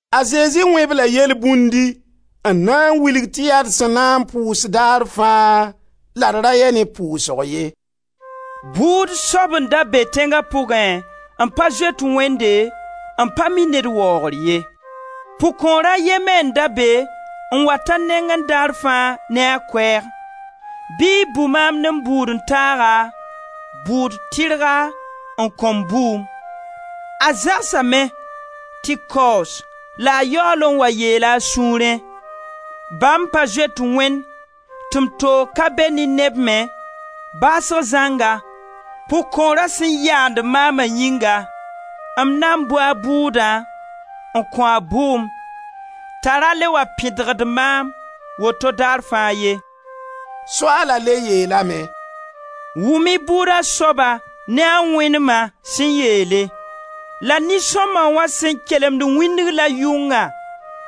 A Zezi wẽ-b-la yelbũndi n na n wilg tɩ yaa d sẽn na n pʋʋs daar fãa la d ra yɛ ne pʋʋsg ye: «Bʋʋd soab n da be tẽnga pʋgẽ n pa zoet Wẽnde, n pa mi ned waoogr ye. Pʋg-kõor a ye me n da be n wat a nengẽ daar fãa ne a koɛɛg: ‹Bɩ y bʋ maam ne m bʋʋd-n-taaga bʋʋd tɩrga n kõ-m bʋʋm.› A zãgsame tɩ kaoos la a yaool n wa yeela a sũurẽ: ‹Ba m pa zoet Wẽnd, tɩ m toog ka be ne neb me, baasg zãnga, pʋg-kõorã sẽn yaand maama yĩnga, m na bʋ a bʋʋdã n kõ-a bʋʋm t'a ra le wa pẽdgd maam woto daar fãa ye.›» Soaala le yeelame: «Wʋm-y bʋʋda soaba ne a wẽnema sẽn yeele. La nin-sõma wã sẽn kelemd wĩndg la yʋngã,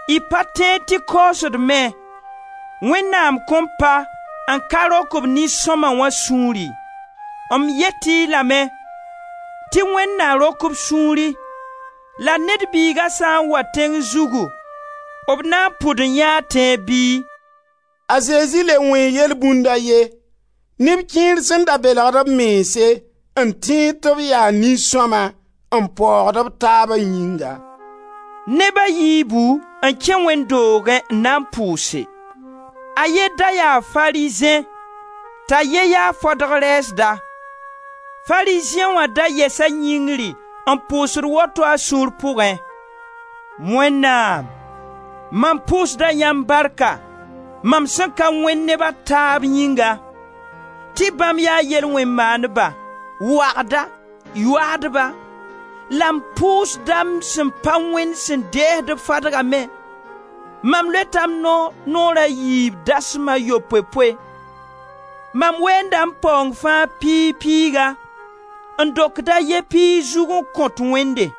y pa tẽed tɩ kaoosd me, Wẽnnaam kõn pa n ka rok b nin-sõma wã sũuri. M yet-y lame tɩ Wẽnd na rok-b sũuri. La Ned Biiga sã n wa tẽng zugu, b na n pʋd n yãee tẽeb bɩ?» A Zezi le wẽe yelbũnd a ye, neb kẽer sẽn da belgd b mense, n tẽed tɩ b yaa nin-sõma, n paoogd b taaba yĩnga: «Neb a yiibu n kẽ wẽnd doogẽ n na n pʋʋse: a ye da yaa Farizẽ, t'a ye ya fadg rɛɛsda. Farizẽ wã da yɛsa yĩngri n pʋʋsd woto a sũur pʋgẽ: ‹Wẽnnaam, mam pʋʋsda yãmb barka mam sẽn ka wẽnd neb a taab yĩnga, tɩ bãmb yaa yel-wẽn-maandba, wãgda, yoaadba; la m pʋʋsda m sẽn pa wẽnd sẽn deesd-b fadga me. Mam loeta m noor naoor a yiib dasma a yopoe-poe; mam weenda m paoong fãa piig piiga, n dokd a ye piig zug n kõt Wẽnde.›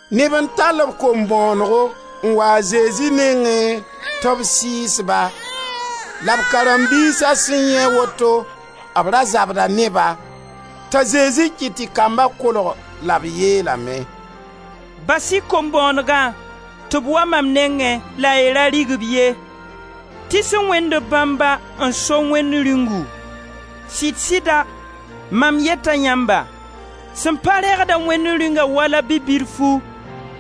Neb n tall b kom-bõonego n waa a Zezi nengẽ tɩ b sɩɩs-ba. La b karen-biisa sẽn yãe woto, b ra zabda ne-ba. T'a Zezi kɩt tɩ kamba kolg la b yeelame: «Bas-y kom-bõonegã tɩ b wa maam nengẽ la y ra rig-b ye tɩ sẽn wẽnd b bãmba n so Wẽnd Rĩungu. Sɩd-sɩda mam yeta yãmba: Sẽn pa reegd-a Wẽnd Rĩungã wala bi-bilfu,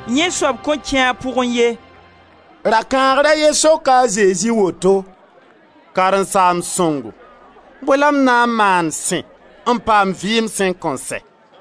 yẽ soab kõn kẽ a pʋgẽ ye.» Rakãagr a ye soka a Zezi woto: «Karen-saamb sõngo, bõe la m na n maan sẽ n paam vɩɩm sẽn kõn sɛ?»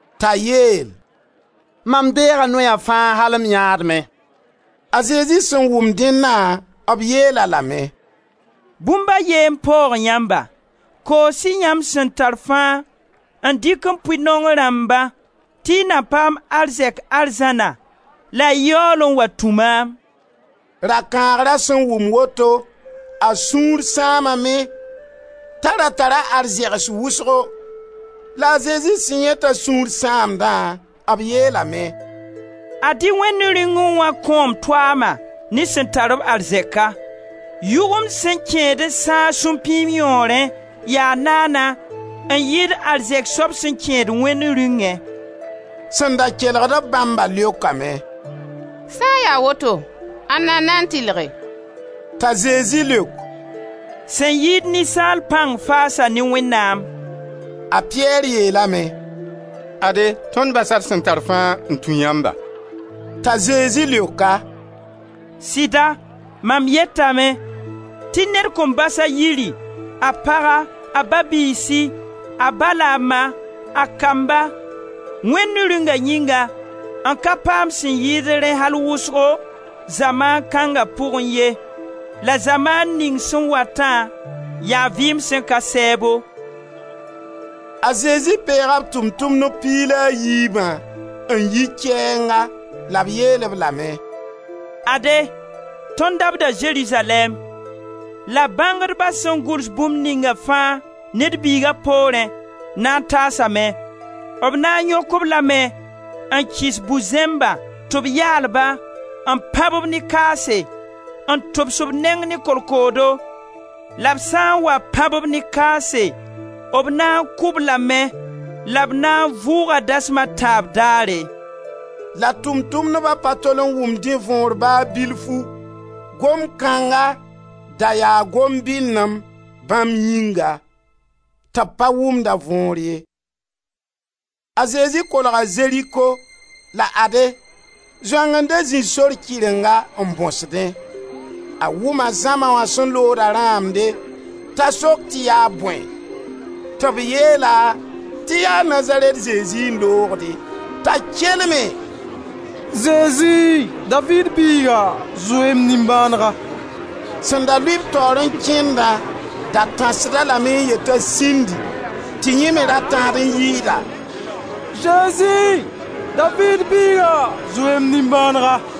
T'a yeel: «Mam deega noya fãa al m yãadmẽ.» A Zezi sẽn wʋm dẽnna, b yeel-a lame: «Bũmb a ye n paoog yamba: koos-y yãmb sẽn tar fãa n dɩk n pʋɩ naong rãmba tɩ y na paam arzɛk arzãna la y yaool n wa tũ maam.» Rakãagra sẽn wʋm woto, a sũur sãamame, t'a ra tara arzɛgs wʋsgo. La a Zezi sẽn yãe t'a sũur sãamdã, b yeelame: «Ad-y Wẽnd Rĩungẽ wã kõom toama ne sẽn tar-b arzɛka! Yʋgemd sẽn kẽed n sãag supĩim yõorẽ yaa naana n yɩɩd arzɛk soab sẽn kẽed Wẽnd Rĩungẽ.» Sẽn da kelgd-b bãmba leokame: «Sã n ya woto, ãnna n na tɩlge?» T'a Zezi leok: «Sẽn yɩɩd ninsaal pãng faasa ne Wẽnnaam.» A Piyɛr yeelame: «Ade tõnd basa d sẽn tar fãa n tũ yãmba.» T'a Zezi leok-a: «Sɩda, mam yetame tɩ ned kõn bas a yiri, a paga, a ba-biisi, a ba la a ma, a kamba, Wẽnd Rĩunga yĩnga, n ka paam sẽn yɩɩd rẽ al wʋsgo, zamaan kãnga pʋgẽ ye, la zamaan ning sẽn watã, yaa vɩɩm sẽn ka sɛɛbo.» A Zezi peega b Tʋʋm-tʋmdb piig la a yiibã n yi kɛɛnga la b yeel-b lame: «Ade, tõnd dabda Zerizalɛɛm, la bãngdba sẽn gʋls bũmb ninga fãa Ned Biiga poorẽ na n taasame, b na n yõk-b lame n kɩs bu-zẽmba tɩ b yaal ba, n pãb-b ne kaase, n tʋbs b neng ne kolkoodo, la b sã n wa pãb-b ne kaase, b na n kʋ-b lame la b na n vʋʋga dasma a tãab daare.» La Tʋʋm-tʋmdba pa tol n wʋm dẽ võor ba bilfu; gomd kãnga da yaa gom-binem bãmb yĩnga, tɩ b pa wʋmd a võor ye. A Zezi kolga Zeriko la ade, zoang n da zĩ sor kɩrenga n bõsdẽ. A wʋma zãma wã sẽn looda rãamde, t'a sok tɩ yaa bõe? Tɩ b yeel-a tɩ yaa Nazarɛt Zezi n loogde. T'a kelme: «Zezi, Daviid biiga, zoe-y m nimbãanega!» Sẽn da lʋɩ-b taoor n kẽndã da tãsd-a lame m yet t'a sĩndi tɩ yẽ me ra tãsd n yɩɩda: «Zezi, Daviid biiga, zoe-y m nimbãanega!»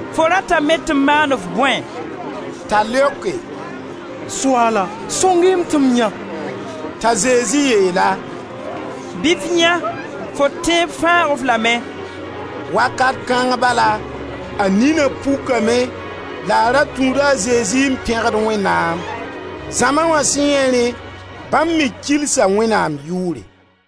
«Fo ratame tɩ m maan-f bõe?» T'a leoke: «Soaala, sõng-y tɩ m yãe!» T'a Zezi yeel-a: «Bɩ f yãe, fo tẽeb fãag-f lame.» Wakat kãng bala, a nina pukame la a ra tũuda a Zezi n pẽgd Wẽnnaam. Zãma wã sẽn yãe rẽ, bãmb me kilsa Wẽnnaam yʋʋre.